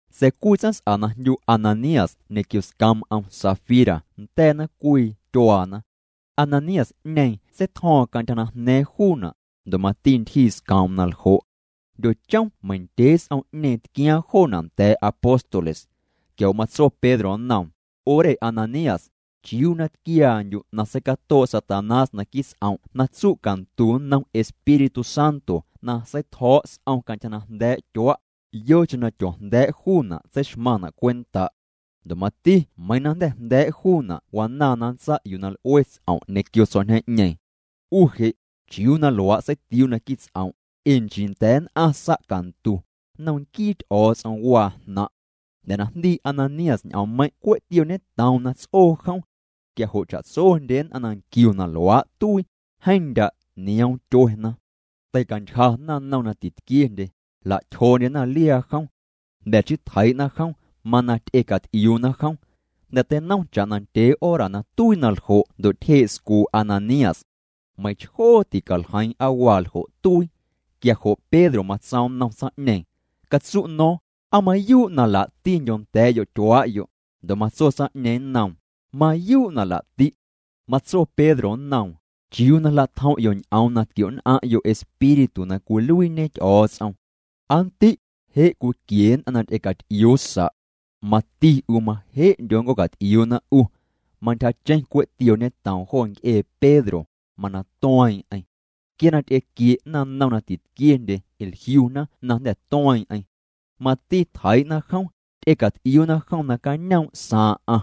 Sa̱a̱ cwii tsaⁿs'a na jndyu Ananías ñequio scoom'm Safira nda̱a̱na cwii tyuaana. Ananías'ñeeⁿ seitjo̱o̱ⁿ cantyja na jna̱a̱ⁿ juuna', ndo' mati ntyjii scoom'm na ljo'. Jndyochom meiⁿ ndyee s'om'ñeeⁿ tquiaaⁿ joona' nda̱a̱ apóstoles. Quia jo' matso Pedro nnoom: —'U re Ananías, ¿chiuu na tquiaandyu' na seicatoo' Satanás naquii' ts'om' na tsu' cantu nnom Espíritu Santo na seitjo̱o̱' s'om cantyja na jnda̱a̱' tyua'? Yocheⁿ na tyoojnda̱a̱' juuna' tseixmaⁿna' cwenta'. Ndo' mati meiiⁿ na jnda̱ jnda̱a̱' juuna' wanaaⁿ na nntsa' yuu na l'ue ts'om' ñequio s'om'ñeeⁿ. 'U je' ¿chiuu na luaa' seitiuu' naquii' ts'om'? Ee nchii nda̱a̱ nn'aⁿ sa' cantu, nnom nquii Ty'o̱o̱ts'om waa jnaⁿ'. Jnda̱ na jndii Ananías ñ'oommeiⁿ' cwe' tiooñetoom na ts'oo jom. Quia jo' cha'tsondye nn'aⁿ na nquiuna na luaa' tuii, jeeⁿ ndya' nioom tyuena. Teicantyja naⁿnom na titquiendye. Jla'tyjoondyena liaa jom. Jnda̱ chii tjeii'na jom, mana ty'ecat'iuuna jom. Jnda̱ teinom cha'na ndyee hora na tuii na ljo' ndo' tyjee' scuu' Ananías. Meiⁿchjoo ticaljeiiⁿ aa waa ljo' tuii. Quia jo' Pedro matsoom nnom tsaⁿ'ñeeⁿ: —Catsu' no̱o̱ⁿ, ¿aa mayuu' na laa'ti'ndyo nda̱a̱'yo' tyuaa'yo'? Ndo' matso tsaⁿ'ñeeⁿ nnoom: —Mayuu' na laa'ti'. Matso Pedro nnoom: —Chiuu na jla'tjom'yo' ñ'oom na tquio'nn'aⁿ'yo' Espíritu na cwiluiiñe Ty'o̱o̱ts'om. Aa ndi', je' cwiquie nn'aⁿ na ty'ecat'iuu sa'. Mati 'u maje'ndyo nnc'oocat'iuuna 'u. Mantyjacheⁿ cwe' tiooñetoom jo nc'ee Pedro, mana tueeⁿ'eⁿ. Quia na ty'equie' naⁿnom na titquiendye jliuna na jnda̱ tueeⁿ'eⁿ. Mati tjeii'na jom, ty'ecat'iuuna jom nacañoom' saaⁿ'aⁿ.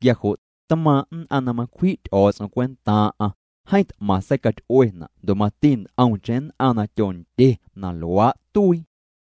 Quia jo', tmaaⁿ' nn'aⁿ na macwji' Ty'o̱o̱ts'om cwentaaⁿ'aⁿ, jeeⁿ t'maⁿ seicaty'uena' ndo' mati nt'omcheⁿ nn'aⁿ na tyondye na luaa' tuii.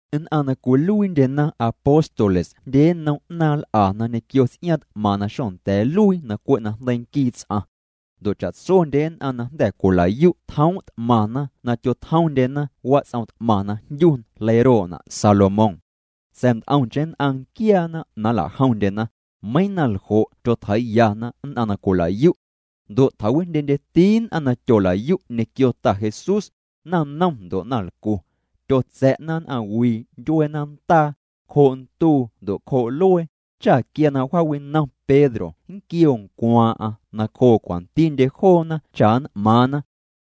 Nn'aⁿ na cwiluiindyena apóstoles jndye nnom 'naaⁿ l'ana ñequio ts'iaaⁿ t'maⁿ na xonda̱a̱ nluii na cwe' najndeii nquii ts'aⁿ. Ndo' cha'tsondye nn'aⁿ na jnda̱ cwila'yu' tjoom' t'maⁿna na tyotjomndyena wats'om t'maⁿ na jndyu leiroo'na' Salomón. Sa̱a̱ nt'omcheⁿ nn'aⁿ nquiaana na nla'jomndyena, meiiⁿ na ljo' tyotjeii'yana nn'aⁿ na cwila'yu'. Ndo' tjawijndyendyeti nn'aⁿ na tyola'yu' ñequio Ta Jesús, naⁿnom ndo' naⁿlcu. Tyotsa̱'na nn'aⁿwii ndyuee nantaa, cjoo' nduu ndo' cjoo' luee, cha quia na wjaawinom Pedro nnquioo ncwaaⁿ'aⁿ nacjoo cwantindye joona cha nn'maaⁿna.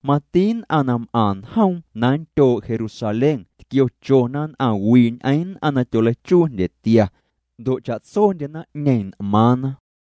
Mati nn'aⁿ na m'aⁿ njoom na nndyoo' Jerusalén tquiochona nn'aⁿwii ñ'eⁿ nn'aⁿ na tyoleichuu jndyetia. Ndo' cha'tsondye naⁿ'ñeeⁿ n'maaⁿna.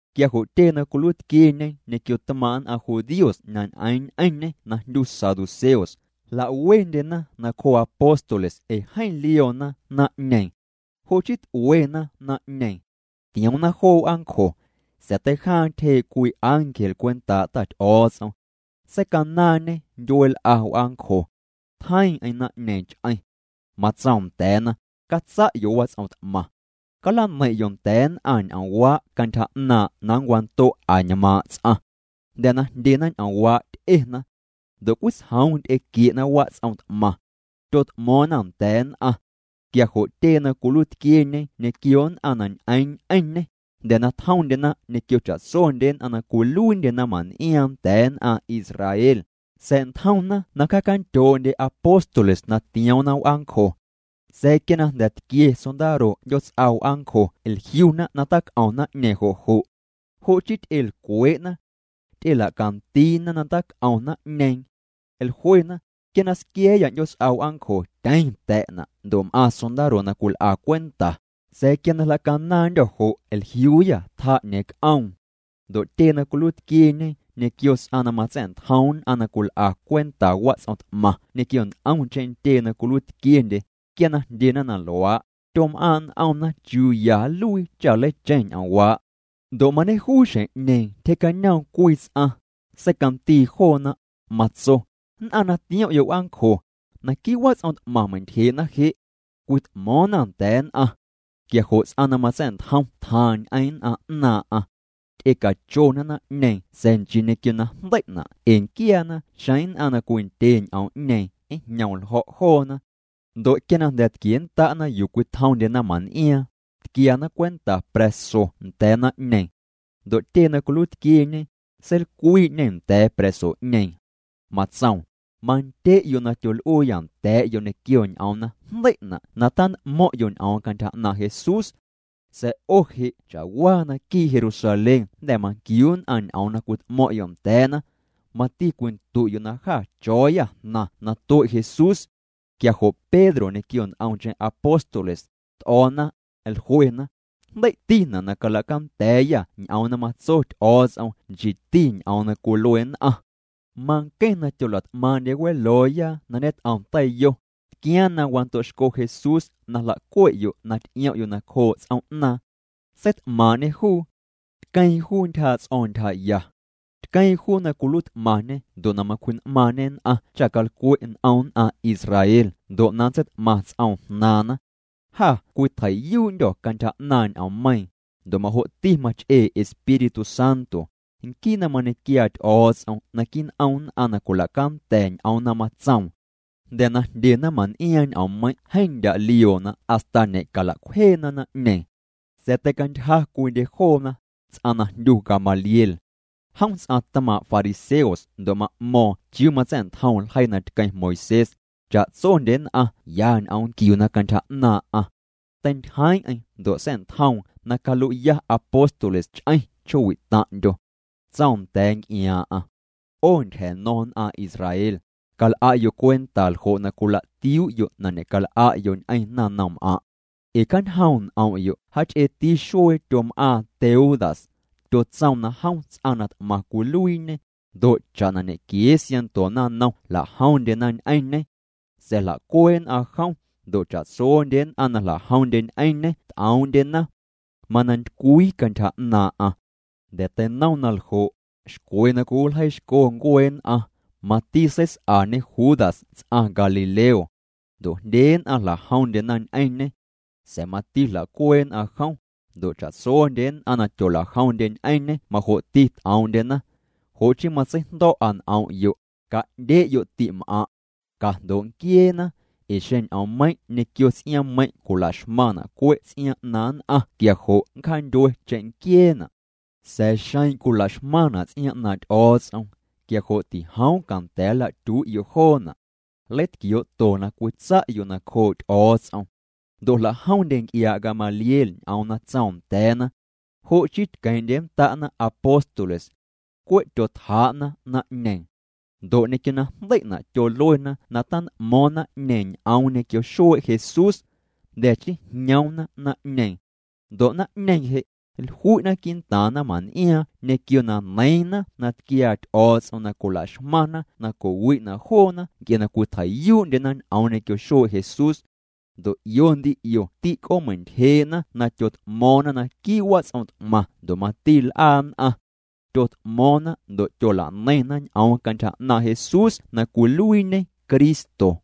Quia jo' tyee na cwiluiitquieñe ñequio tmaaⁿ' nn'aⁿ judíos na ñ'eeⁿ ñ'eⁿñê na jndyu saduceos, jlawendyena nacjoo apóstoles ee jeeⁿ lioona naⁿ'ñeeⁿ. Jo' chii t'uena naⁿ'ñeeⁿ. Tioomna joo w'aancjo. Sa̱a̱ teijaaⁿ tyjee' cwii ángel cwentaa' Ta Ty'o̱o̱ts'om. Seicanaaⁿñê ndyueel'a w'aancjo. Tjeiiⁿ'eⁿ naⁿ'ñeeⁿ ch'eⁿ. Matsoom nda̱a̱na: —Catsa'yo' wats'om t'maⁿ. Calaneiⁿ'yo' nda̱a̱ nn'aⁿ ñ'oomwaa' cantyja 'naaⁿ' na nncwando' añmaaⁿ' ts'aⁿ. Jnda̱ na jndyena ñ'oomwaa' ty'ena. Ndo' cwitsjoom ty'equie'na wats'om t'maⁿ. Tyot'mo̱o̱ⁿna nda̱a̱ nn'aⁿ. Quia jo' tyee na cwiluiitquieñe ñequio nn'aⁿ na ñ'eeⁿ ñ'eⁿñê, jnda̱ na tjomndyena ñequio cha'tsondye nn'aⁿ na cwiluiindye naⁿmaⁿn'iaaⁿ nda̱a̱ nn'aⁿ Israel, sa̱'ntjomna na cjaacandyoo'ndye apóstoles na tioomna w'aancjo. Sa̱a̱ quia na jnda̱ tquie sondaro 'ndyoots'a w'aancjo jliuna na tac'om naⁿ'ñeeⁿ jo' jo'. Jo' chii ty'elcwee'na. Ty'ela'candiina na tac'om naⁿ'ñeeⁿ. Jluena: —Quia na squia̱a̱yâ 'ndyoots'a w'aancjo tyeⁿ ta̱'na' ndo' m'aⁿ sondaro na cwil'a cwenta, sa̱a̱ quia na jla'canaaⁿndyô̱ jo' jliuuyâ tjaa'ñeeⁿ c'oom. Ndo' tyee na cwiluiitquieñe ñequio ts'aⁿ na matsa̱'ntjom nn'aⁿ na cwil'a cwenta wats'om t'maⁿ ñequio nt'omcheⁿ ntyee na cwiluiitquiendye, quia na jndyena na luaa', tyom'aaⁿ' n'omna chiuu ya nluii cha nleicheⁿ ñ'oomwaa'. Ndo' mañejuu xjeⁿ'ñeeⁿ tyjee'cañoom cwii ts'aⁿ, seicandii joona, matso: —Nn'aⁿ na tiom'yo' w'aancjo, naquii' wats'om t'maⁿ meintyjee'na je'. Cwit'mo̱o̱ⁿna nda̱a̱ nn'aⁿ. Quia jo' ts'aⁿ na matsa̱'ntjom tjaaⁿ ñ'eⁿ nn'aⁿ 'naaⁿ'aⁿ. Ty'ecachona naⁿ'ñeeⁿ sa̱a̱ nchii ñequio na jndei'na' ee nquiaana xeⁿ nn'aⁿ na cwindye ñ'oom'ñeeⁿ njñom ljo̱' joona. Ndo' quia na jnda̱ tquiennda'na yuu cwitjomndye naⁿman'iaaⁿ, tquiana cwenta pra̱so nda̱a̱ naⁿ'ñeeⁿ. Ndo' tyee na cwiluiitquieñe, seilcwii'ñê nda̱a̱ pra̱so'ñeeⁿ. Matsoom: —Mandye'yo' na tyol'uuyâ nda̱a̱'yo' ñequio ñ'oom na jndei'na' na tant'mo̱ⁿ'yo' ñ'oom cantyja 'naaⁿ' Jesús. Sa̱a̱ 'o je' cha'waa naquii' Jerusalén jnda̱ manquiu nn'aⁿ ñ'oom na cwit'mo̱ⁿ'yo' nda̱a̱na. Mati cwindu'yo' na jâ cho̱o̱yâ jnaⁿ na tue' Jesús. Quia jo' Pedro ñequio nt'omcheⁿ apóstoles, t'o̱o̱na, jluena: —Jndei'tina' na calacanda̱a̱yâ ñ'oom na matso Ty'o̱o̱ts'om nchiiti ñ'oom na cwilue nn'aⁿ. Manqueⁿ na tyola't'maaⁿ'ndye welooya na ñet'om teiyo, tquiaaⁿ na wando'xco Jesús na jla'cue'yo' na ty'iom'yo' nacjoo' ts'oom'naaⁿ. Seit'maaⁿ'ñê juu. Tqueeⁿ juu ntyjaa' ts'o̱o̱ⁿ ntyjaya. Tqueeⁿ juu na cwiluiit'maaⁿñe ndo' na macwji'n'maaⁿñe nn'aⁿ cha calcwe' n'om nn'aⁿ Israel ndo' na nntseit'maⁿ ts'om jnaaⁿna. Jâ cwitjei'yuu'ndyô̱ cantyja 'naaⁿ ñ'oommeiiⁿ, ndo' majo'ti mach'ee Espíritu Santo, nquii na mañequiaa Ty'o̱o̱ts'om naquii' n'om nn'aⁿ na cwila'canda̱ ñ'oom na matsoom. Jnda̱ na jndye naⁿmaⁿn'iaaⁿ ñ'oommeiⁿ' jeeⁿ ndya' lioona hasta ñe'cala'cwjeena naⁿ'ñeeⁿ. Sa̱a̱ teicantyja cwiindye joona, ts'aⁿ na jndyu Gamaliel. Jom ts'aⁿ tmaaⁿ' fariseos ndo' ma'mo̱o̱ⁿ chiuu matsa̱'ntjom ljeii na tqueⁿ Moisés, cha'tsondye nn'aⁿ ya ñ'oom nquiuna cantyja 'naaⁿ'aⁿ. Teintyjeeⁿ'eⁿ ndo' sa̱'ntjoom na calui'ya apóstoles ch'eⁿ chjoowi' taⁿ'ndyo. Tsoom nda̱a̱ nc'iaaⁿ'aⁿ: —'O ntyja̱ño̱ⁿ nn'aⁿ Israel, cal'a'yo' cwenta ljo' na cwilatiuu'yo' na ñe'cal'a'yo' ñ'eⁿ naⁿnomm'aⁿ'. Ee cjañjoom' n'om'yo' jaach'eeti xuee tyom'aaⁿ Teudas. Tyotsoom na jom ts'aⁿ na t'maⁿ cwiluiiñe, ndo' cha'na ñequiee siaⁿnto naⁿnom jla'jomndyena ñ'eⁿñê. Sa̱a̱ jla'cuee' nn'aⁿ jom, ndo' cha'tsondye nn'aⁿ na jla'jomndye ñ'eⁿñê t'oom'ndyena. Mana ntycwii cantyja 'naaⁿ'aⁿ. Jnda̱ teinom na ljo', xcwe na cwiwiljeiixco ncuee nn'aⁿ, mati seis'añe Judas ts'aⁿ Galileo. Ndo' jndye nn'aⁿ jla'jomndyena ñ'eⁿñê. Sa̱a̱ mati jla'cuee' nn'aⁿ jom, ndo' cha'tsondye nn'aⁿ na tyola'jomndye ñ'eⁿñê majo'ti t'oom'ndyena. Jo' chii matseijndo̱'a n'om'yo', ca'ndye'yo' ti'm'aⁿ'. Cajndoo' nquieena, ee xeⁿ ñ'oommeiⁿ' ñequio ts'iaaⁿmeiⁿ' cwila'xmaⁿna' cwe' ts'iaaⁿ 'naaⁿ nn'aⁿ quia jo' nncjaandyue cheⁿnquieena'. Sa̱a̱ xeⁿ cwila'xmaⁿna' ts'iaaⁿ 'naaⁿ' Ty'o̱o̱ts'om, quia jo' tijoom canda̱a̱ na nlatyui'yo' joona'. Nleitquioo'to na cwitsa'yo' nacjoo' Ty'o̱o̱ts'om. Ndo' jla'jomndye nc'iaa' Gamaliel ñ'oom na tsoom nda̱a̱na. Jo' chii tqueeⁿ'nnda'na apóstoles. Cwe' tyotjaa'na naⁿ'ñeeⁿ. Ndo' ñequio na jndei'na' tyoluena na tant'mo̱o̱ⁿ naⁿ'ñeeⁿ ñ'oom ñequio xuee' Jesús. Jnda̱ chii jñoomna naⁿ'ñeeⁿ. Ndo' naⁿ'ñeeⁿ je', jlui'na quii'ntaaⁿ naⁿmaⁿn'iaaⁿ ñequio na neiiⁿna na tquiaa Ty'o̱o̱ts'om na cwila'xmaⁿna na co'wi'na' joona nc'e na cwitjei'yuu'ndyena ñ'oom ñequio xuee' Jesús. Ndo' 'io ndi 'io tîc'oomeintyjee'na na tyot'mo̱o̱ⁿna naquii' wats'om t'maⁿ ndo' mati l'aa nn'aⁿ. Tyot'mo̱o̱ⁿna ndo' tyola'neiⁿna ñ'oom cantyja 'naaⁿ' Jesús na cwiluiiñe Cristo.